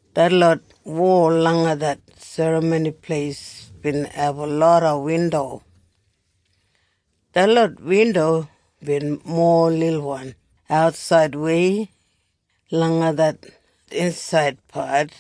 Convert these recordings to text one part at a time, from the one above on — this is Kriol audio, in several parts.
Detlot wol langa det Serramoni Pleis bin abum loda windo. Detlot windo bin mowa lilwan atsaidwei langa det insaidpat.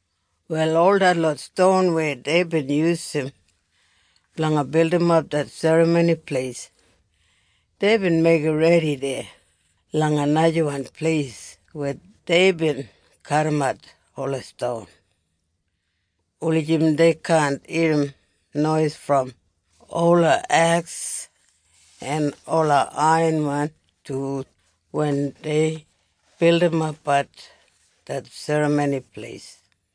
Wal ol detlot ston weya deibin yusum blanga bildimap det Serramoni Pleis, deibin meigim redi deya langa najawan pleis weya deibin kadimat ola ston, wulijim dei kaan irrim nois brom ola eks en ola aiyanwan tul wen dei bildimapbat det Serramoni Pleis.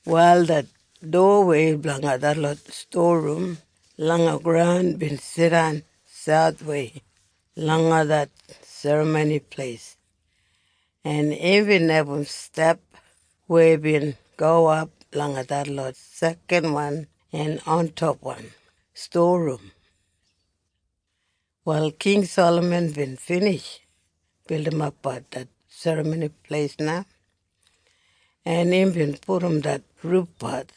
Wal det dowawei blanga detlot stowa rum langa graun bin jidan sauthwei langa det Serramoni Pleis, en imbin abum step weya bin gowap langa detlot sekanwan en ontopwan stowa rum. Wal King Salaman bin binij bildimapbat det Serramoni Pleis na. En imbin pudum det rufpat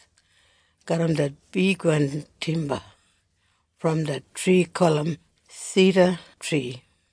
garram det bigwan timba brom det tri gulum sidatri.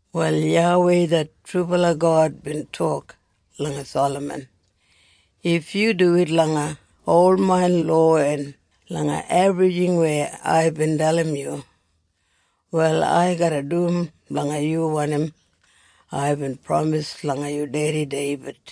Wal YAWEI det trubala God bin tok langa Salaman, “If yu duwit langa ol main lowa en langa ebrijing weya aibin dalim yu, wal ai garra dum blanga yu wanim aibin pramis langa yu dedi Deibid.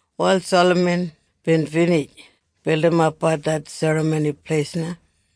Wal Salaman bin binij bildimapbat det Serramoni Pleis na.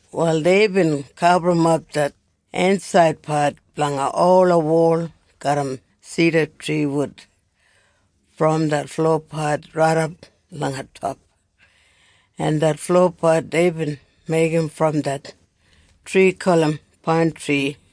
Wal deibin gaburrumap det insaidpat blanga ola wol garram sidatri wud brom det flopat raidap langa top, en det flopat deibin meigim brom det tri gulum paintri.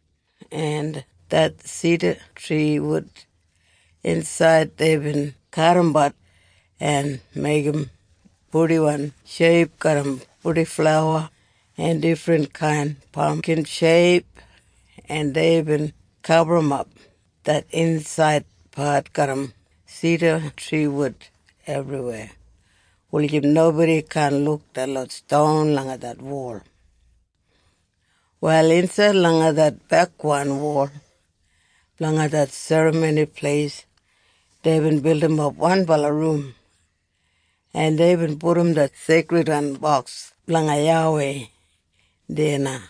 En det sidatri wud insaid deibin kadimbat en meigim purdiwan sheip garram purdiflawa en difrinkain pamkin sheip en deibin gaburrumap det insaidpat garram sidatri wud ebriweya, wulijim nobodi kaan luk detlot ston langa det wol. Wal insaid langa det bekwan wol blanga det Serramoni Pleis deibin bildimap wanbala rum, en deibin pudum det Seikridwan Boks blanga YAWEI deya na.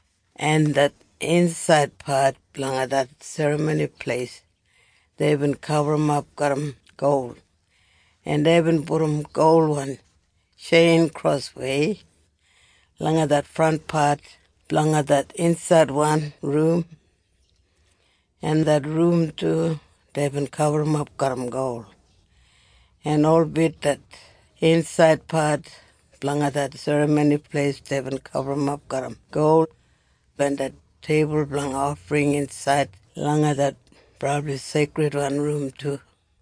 En det insaidpat blanga det Serramoni Pleis deibin gaburrumap garram gol, en deibin pudum golwan tjein kroswei langa det frantpat blanga det insaidwan rum, en det rum du deibin gaburrumap garram gol. En holbit det insaid pat blanga det Serramoni Pleis deibin gaburrumap garram gol, en det teibul blanga ofring insaid langa det Brabli Seikridwan Rum du.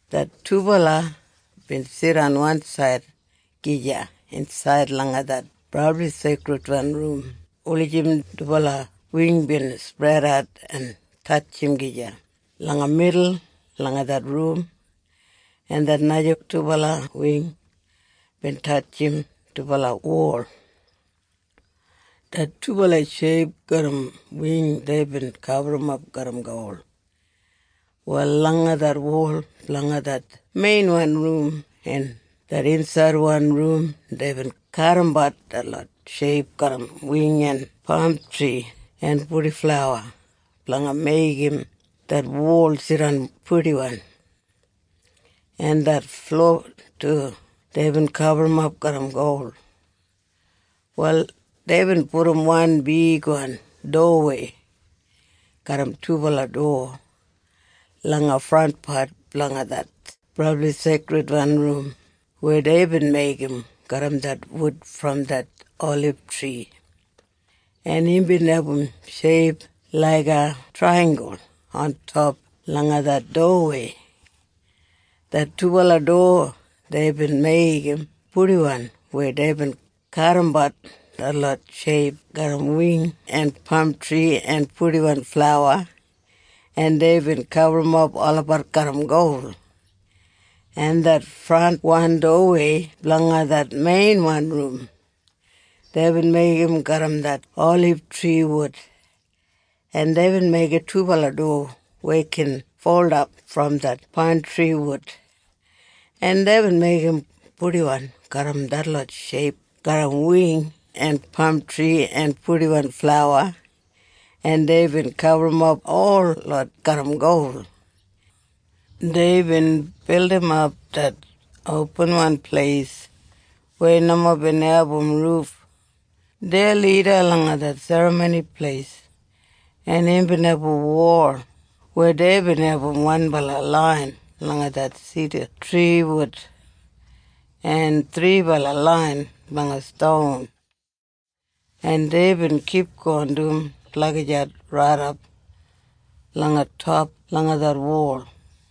Det dubala bin jidan wansaid gija insaid langa det Brabli Seikridwan Rum, wulijim dubala wing bin spredat en tatjim gija langa midul langa det rum, en det naja dubala wing bin tatjim dubala wol. Det dubala sheip garram wing deibin gaburrumap garram gol. Wal langa det wol blanga det meinwan rum en det insaidwan rum deibin kadimbat detlot sheip garram wing en pamtri en purdiflawa blanga meigim det wol jidan purdiwan. En det flo du deibin gaburrumap garram gol. Wal deibin pudum wan bigwan dowawei garram dubala dowa langa frantpat blanga det Brabli Seikridwan Rum weya deibin meigim garram det wud brom det olibtri, en imbin abum sheip laiga traiyenggul ontop langa det dowawei. Det dubala dowa deibin meigim purdiwan weya deibin kadimbat detlot sheip garram wing en pamtri en purdiflawa en deibin gaburrumap olabat garram gol. En det frantwan dowawei blanga det meinwan rum, deibin meigim garram det olibtri wud. En deibin meigim dubala dowa weya gin foldap brom det paintri wud, en deibin meigim purdiwan garram detlot sheip garram wing en pamtri en purdiflawa en deibin gaburrumap holot garram gol. Deibin bildimap det opinwan pleis weya nomo bin abum ruf, deya lida langa det Serramoni Pleis, en imbin abum wol weya deibin abum wanbala lain blanga sidatri wud en thribala lain blanga ston, en deibin kipgon dum lagijat raidap langa top langa det wol.